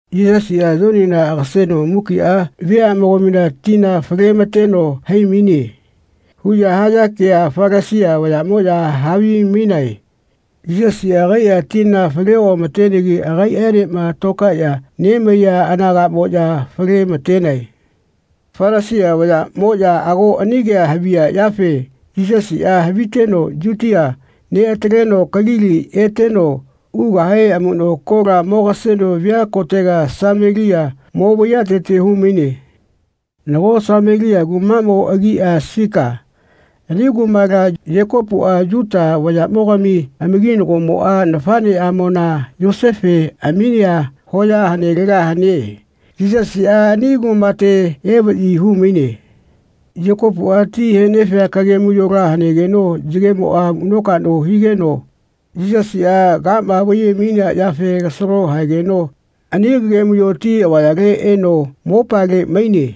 “Yisasiꞌa Yonina agaseno mukiꞌa veaꞌmogamina tina fale-ma-teno hai-maine.” huꞌya haya ke Falasia vayaꞌmoꞌya havimainae. Yisasiꞌa agaiꞌa tina fale oꞌama-tenegi agaiꞌaenema tokaeꞌya nemaiya anagaꞌamoꞌya fale-ma-tenae. Falasia vayaꞌmoꞌya ago ani kea haviya yafe Yisasiꞌa haviteno Yutia neꞌataleno Kalili eteno ugahe amuꞌno kola mogaseno via kotega Samelia mo vaiyatete hu-maine. Nago Samelia kumaꞌmo agia Sika. Ani kumala Yekopuꞌa Yuta vayaꞌmogami amakinagomoꞌa nafaꞌneꞌamona Yosefe aminea hoya hanelega hane. Yisasiꞌa ani kumate evaꞌyi hu-maine. Yekopuꞌa ti he-nefia kagemuyola hanegeno yagemoꞌa amuꞌno-kaꞌno higeno Yisasiꞌa kama vaiye-mainea yafe kasalo haegeno ani kagemuyo ti avayale eno mopale maine.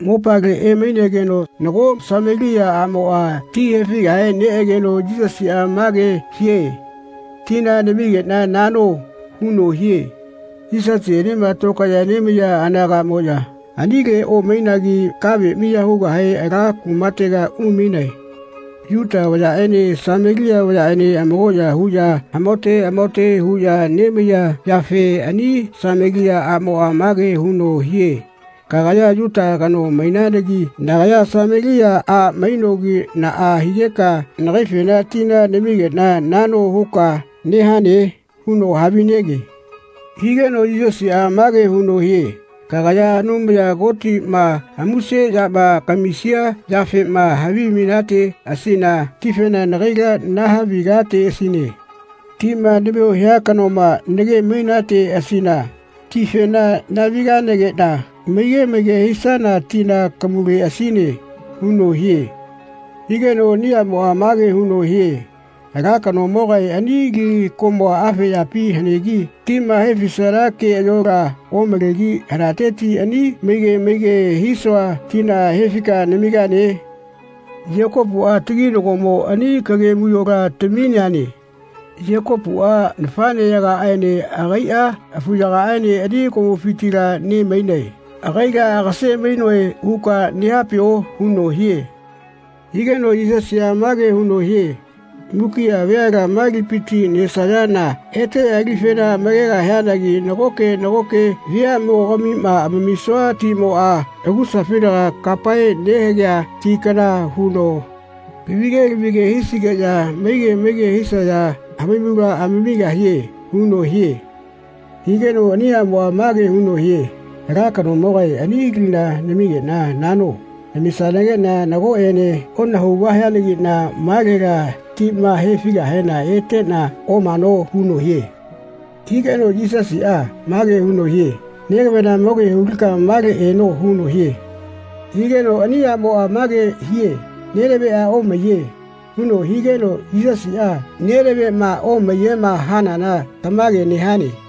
Mopale emainegeno nago Samelia aꞌmoꞌa ti he-figahe neꞌegeno Yisasiꞌa mage hie “Tina namigeꞌna nano.” huno hie. (Yisasienema tokaeꞌya nemaiya anagaꞌmoꞌya anile omainagi kave miya hugahe ala kumatega umainae.) Yuta vayaꞌene Samelia vayaꞌene amakoꞌya huꞌya amahaote amahaote huꞌya nemaiya yafe ani Samelia aꞌmoꞌa mage huno hie “Kagaya Yuta kano mainanagi nagaya Samelia a mainogi naꞌa higeka nagaifena tina namigeꞌna nano huka nehane?” huno havinege Higeno Yisasiꞌa mage huno hie “Kagaya Anumaya Kotiꞌma amuse yama kamisia yafema havimainateꞌasina tifena nagaila nahavi-gateꞌasine. Tima namio hia kanoma nagemainateꞌasina tifena nahaviganageꞌna maige maige hisana tina kamuleꞌasine.” huno hie. Higeno ani aꞌmoꞌa mage huno hie “Ala kanomoga ani li komua afe yapi hanegi tima he-fisana keꞌayola omalegi hanateti ani maige maige hisua tina he-fika namigane? Yekopuꞌa, taginagomo ani kagemuyola tamineane. Yekopuꞌa nafaꞌneyagaꞌaene agaiꞌa afuyagaene ani komufitila ne-mainae. ‘Agaila agase-mainoe.’ huka nehapio?” huno hie. Higeno Yisasiꞌa mage huno hie “Mukiꞌa veala ma lipiti nesayana eteꞌya lifena amakegahianagi nagoke nagoke veaꞌmogamima amamisua timoꞌa amakusafinaga kapae nehagea ti kana huno lavige lavige hisigeꞌya maige maige hisaya hamaimula amamigahie.” huno hie. Higeno ani aꞌmoꞌa mage huno hie “Ala kanomogae ani lina namigeꞌna nano. Namisanageꞌna nagoꞌene onahaugahianagiꞌna malela tima he-figahena eteꞌna omano.” huno hie. Higeno Yisasiꞌa mage huno hie “Negavena mo ke hu-lika male eno.” huno hie. Higeno ani aꞌmoꞌa mage hie “Nenaveꞌa omaiye.” huno higeno Yisasiꞌa “Nenaveꞌma omaiyema hanana tamage nehane.”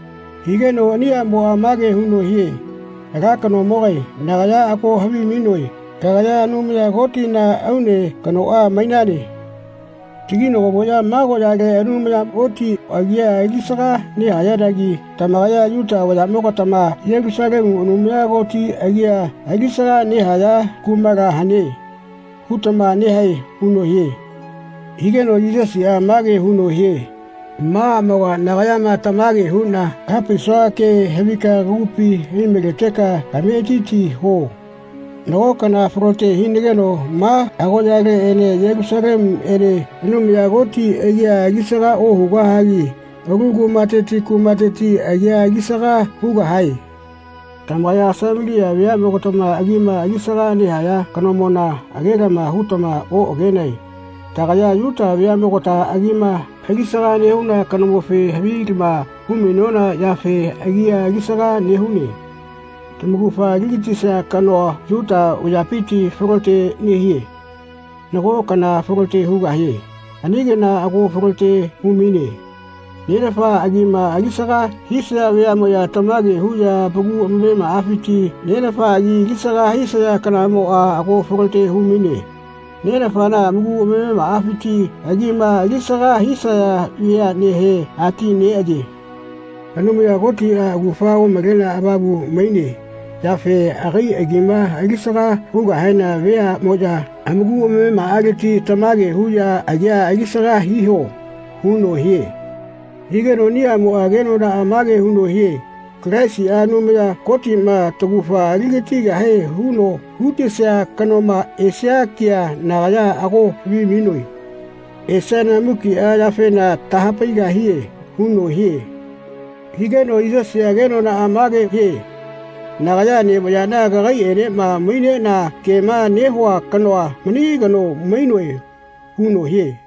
Higeno ani aꞌmoꞌa mage huno hie “Ala kanomogae nagaya ago havimainoe kagaya Anumaya Kotina aune kanoꞌa mainane. Taginagomoꞌya ma agoꞌyale Anumaya Koti agia alisaga nehayanagi tamakaya Yuta vayaꞌmogatama ‘Yelusalemu Anumaya Koti agia alisaga nehaya kumala hane.’ hutama nehae.” huno hie. Higeno Yisasiꞌa mage huno hie “Ma aꞌmoga nagayama tamage huꞌna kaha-paisua ke havika kagupi ai-maleteka kametiti huo. Nago kana falote hinageno ma agoꞌyaleꞌene Yelusalemuene Anumaya Koti agia alisaga ohugahagi alu kumateti kumateti agia alisaga hugahae. Tamakaya Samelia veaꞌmogatama agima alisaga nehaya kanomona age-lama hutama oꞌagenae. Tagaya Yuta veaꞌmogata agima alisaga nehuna kanomofe havilama hu-mainona yafe agia alisaga nehune. Tamaugafa ali-gatisia kanoa Yuta vayapiti falote nehie. Nago kana falote hugahie. Ani kana ago falote hu-maine. Nenafa agima alisaga hisaya veaꞌmoya tamage huꞌya amaku amamemaꞌafiti Nenafa agi alisaga hisaya kanamoꞌa ago falote hu-maine. Nenafana amaku amamemaꞌafiti agima alisaga hisaya veaꞌnehe ati neꞌaye. Anumaya Kotiꞌa augafa omalenea avamula mainea yafe agai agima alisaga hugahena veaꞌmoya amaku amamemaꞌaleti tamage huꞌya agia alisaga hiho.” huno hie. Higeno ani aꞌmoꞌa kenonaꞌa mage huno hie “Kalaisiꞌa, Anumaya Kotiꞌma taugafa ali-gatigahie huno hu-tesia kanoma esia kea nagaya ago havimainoe. Esiana mukiꞌa yafena taha-paigahie.” huno hie. Higeno Yisasiꞌa kenonaꞌa mage hie “Nagaya nevayaꞌna kakaiꞌenema maineꞌna kema nehua kanoa mani kano mainoe.” huno hie.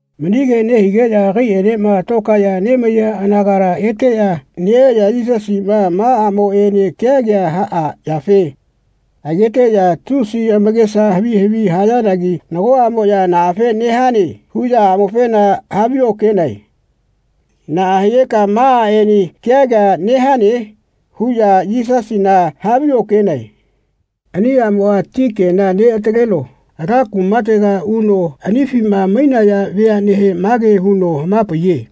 Mani kea nehigeꞌya agaiꞌaenema tokaeꞌya nemaiya anagala eteꞌya neꞌeꞌya Yisasiꞌma aꞌmoꞌenema kea kea haꞌaꞌyafe ageteꞌya tusi amakesa havi havi hayanagi nagoꞌamoꞌya “Naꞌafe nehane?” huꞌya aꞌmofena haviokenae. “Naꞌa higeka ma aꞌene kea kea nehane?” huꞌya Yisasina haviokenae. Ani aꞌmoꞌa ti kena neꞌataleno ala kumatega uno anifima mainaya veaꞌnehe mage huno hama-paiye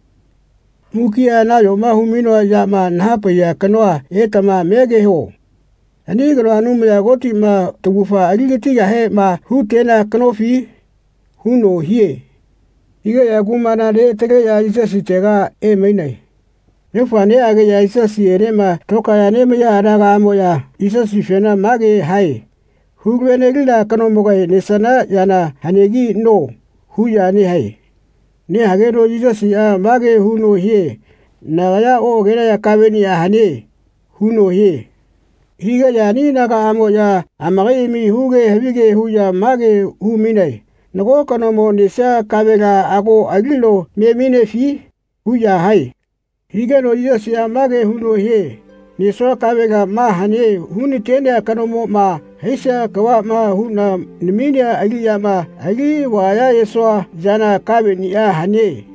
“Mukiꞌa nayoma hu-mainoa yama naha-paiya kanoa etama megeho. Ani kanoa Anumaya Kotiꞌma taugafa ali-gatigahema hu-tenea kanofi?” huno hie. Higeꞌya kumala neꞌataleꞌya Yisasitega emainae. Yaufa neꞌageꞌya Yisasiꞌenema tokaeꞌya nemaiya anagaꞌamoꞌya Yisasifena mage hae “Hulave-nelina kanomoga nesana yana hanegi no.” huꞌya nehae. Nehageno Yisasiꞌa mage huno hie “Nagaya oꞌagenaya kaveꞌnia hane.” huno hie. Higeꞌya ani anagaꞌamoꞌya amakaiꞌami huge havige huꞌya mage hu-mainae “Nago kanomo nesia kavela ago alino me mainefi?” huꞌya hae. Hageno Yisasiꞌa mage huno hie “Nesua kavela ma hane hu-na-tenea kanomoꞌma haisia kavaꞌma huꞌna naminea aliꞌyana alivaya ayesua yana kaveꞌniꞌa hane.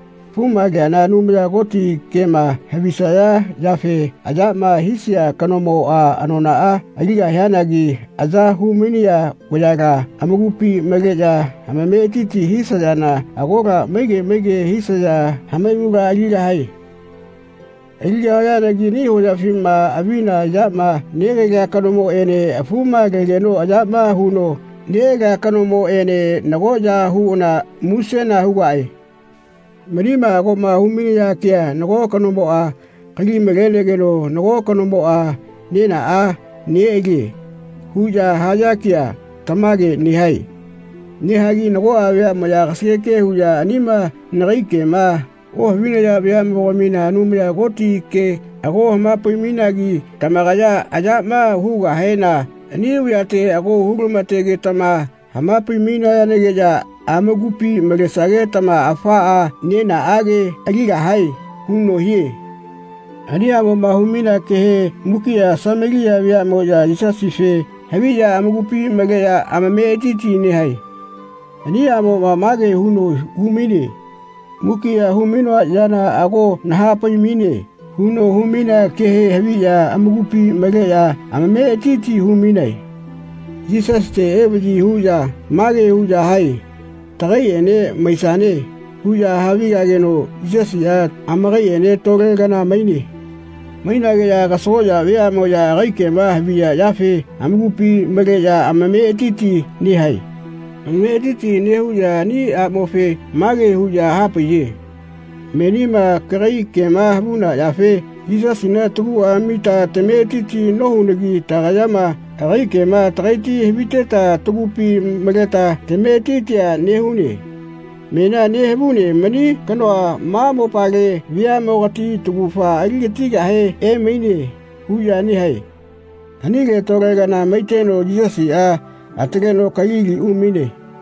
Afuma leana Anumaya Koti kema havisaya yafe ayama hisia kanomoꞌa anonaꞌa aligahianagi aya hu-mainaya vayala amakupi maleꞌya amametiti hisayana agola maige maige hisaya hamaimula aligahae. Aligahayanagi ani hoyafima avina yama negalia kanomoꞌene afumalegeno ayama huno neꞌalia kanomoꞌene nagoꞌya huꞌana musena hugaꞌe. Manima agoꞌma hu-mainaya kea ‘Nago kanomoꞌa kali-malegeno nago kanomoꞌa nenaꞌa neꞌalie.’ huꞌya haya kea tamage nehae. Nehagi nagoꞌa veaꞌmoꞌya kasageke huꞌya anima nagai kema ohavinaya veaꞌmogamina Anumaya Koti ke ago hama-pai-mainagi tamakaya ayama hugahena ani vayate ago hu-lama-togetama hama-pai-mainayanagiꞌya amakupi malesagetama afaꞌa nenaꞌage aligahae.” huno hie. Ani aꞌmoꞌma hu-mainea kehe mukiꞌa Samelia veaꞌmoꞌya Yisasife haviꞌya amakupi maleꞌya amametiti nehae. Ani aꞌmoꞌa mage huno hu-maine “Mukiꞌa hu-mainoa yana ago naha-pai-maine.” huno hu-mainea kehe haviꞌya amakupi maleꞌya amametiti hu-mainae. Yisasite evaꞌyi huꞌya mage huꞌya hae “Tagaiꞌene maisane.” huꞌya havigageno Yisasiꞌa amakaiꞌene tole kana maine. Mainegeꞌya kasagoꞌya veaꞌmoꞌya agai kema haviya yafe amakupi maleꞌya amametiti nehae. Amametiti nehuꞌya ani aꞌmofe mage huꞌya hapaiye “Menima kagai kema havuna yafe Yisasina taguꞌa amita tametiti nohunagi tagayama agai kema tagaiti haviteta tagupi maleta tametitia nehune. Menia nehavune mani kanoa ma mopale veaꞌmogati taugafa ali-gatigahe emaine.” huꞌya nehae. Anile tole kana maiteno Yisasiꞌa ataleno Kalili umaine.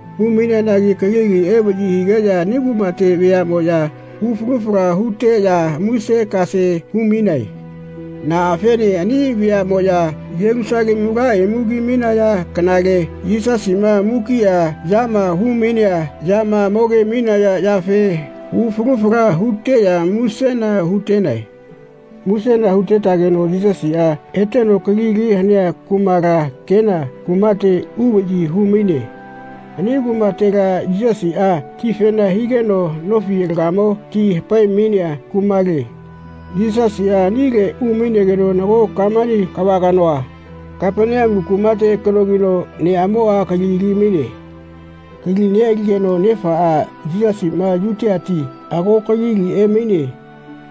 Hu-maineanagi Kalili evaꞌyi higeꞌya ani kumate veaꞌmoꞌya hu falu fala huteꞌya muse-kase hu-mainae. Naꞌafene ani veaꞌmoꞌya Yelusalemu ala imu ki-mainaya kanale Yisasiꞌma mukiꞌa yama hu-mainea yama moge-mainaya yafe hu falu fala huteꞌya musena hu-tenae. Musena hutetageno Yisasiꞌa eteno Kalili hanea kumala Kena kumate uvaꞌyi hu-maine. Ani kumatela Yisasiꞌa tifena higeno nofi alagamo ti hapae-mainea kumale. Yisasiꞌa anile umainegeno nago kamani kava kanoa, Kapaneamu kumate kanogino, neꞌamoꞌa kali ali-maine. Kali neꞌaligeno nefaꞌa “Yisasiꞌma Yutiati ago Kalili emaine.”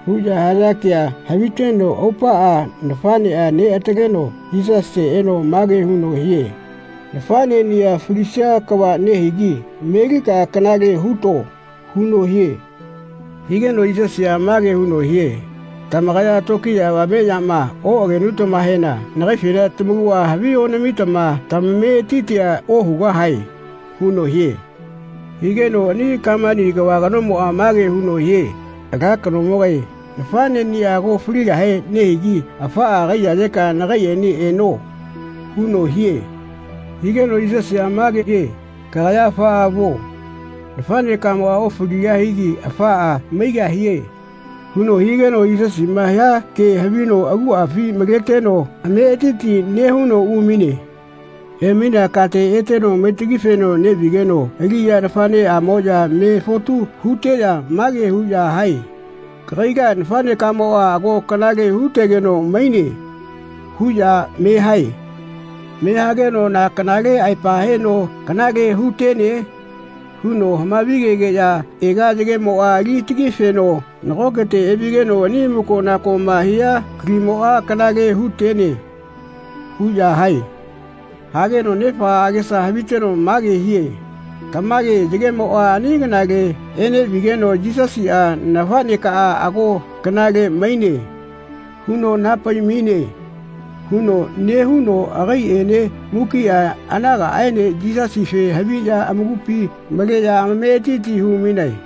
huꞌya haya kea haviteno aupaꞌa nafaꞌneꞌa neꞌataleno Yisasite eno mage huno hie “Nafaꞌneꞌniꞌa falisia kava nehigi melika kanale huto.” huno hie. Higeno Yisasiꞌa mage huno hie “Tamakaya tokiya avame yama oꞌagenutamahena nagaifena tamakuꞌa havi onamitama tamametitia ohugahae.” huno hie. Higeno ani kamani kava kanomoꞌa mage huno hie “Ala kanomogae nafaꞌneꞌniꞌa ago faligahe nehigi afaꞌa kaiyayeka nagaiꞌene eno.” huno hie. Higeno Yisasiꞌa mage hie “Kagaya afaꞌa vuo. Nafaꞌnekamoꞌa ofaligahigi afaꞌa maigahie.” huno higeno Yisasiꞌma hia kea havino akuꞌafi maleteno ametiti nehuno umaine. Emainea kate eteno maitagifeno neꞌvigeno aliꞌya nafaꞌneꞌamoꞌya me fotu huteꞌya mage huꞌya hae “Kagaila nafaꞌnekamoꞌa ago kanale hu-tegeno maine.” huꞌya me-hae. Me hageno “Na kanale aepa heno kanale hu-tene?” huno hamavi-gegeꞌya “Ega yagemoꞌa ali tagifeno nagokete evigeno ani amuko-nakoma haiya kalimoꞌa kanale hu-tene.” huꞌya hae. Hageno nefaꞌa agesa haviteno mage hie “Tamage yagemoꞌa ani kanaꞌale eneꞌvigeno Yisasiꞌa ‘Nafaꞌneka ago kanale maine.’ huno naha-pai-maine.” huno nehuno agaiꞌaene mukiꞌa anagaꞌaene Yisasife haviꞌya amakupi maleꞌya amametiti hu-mainae.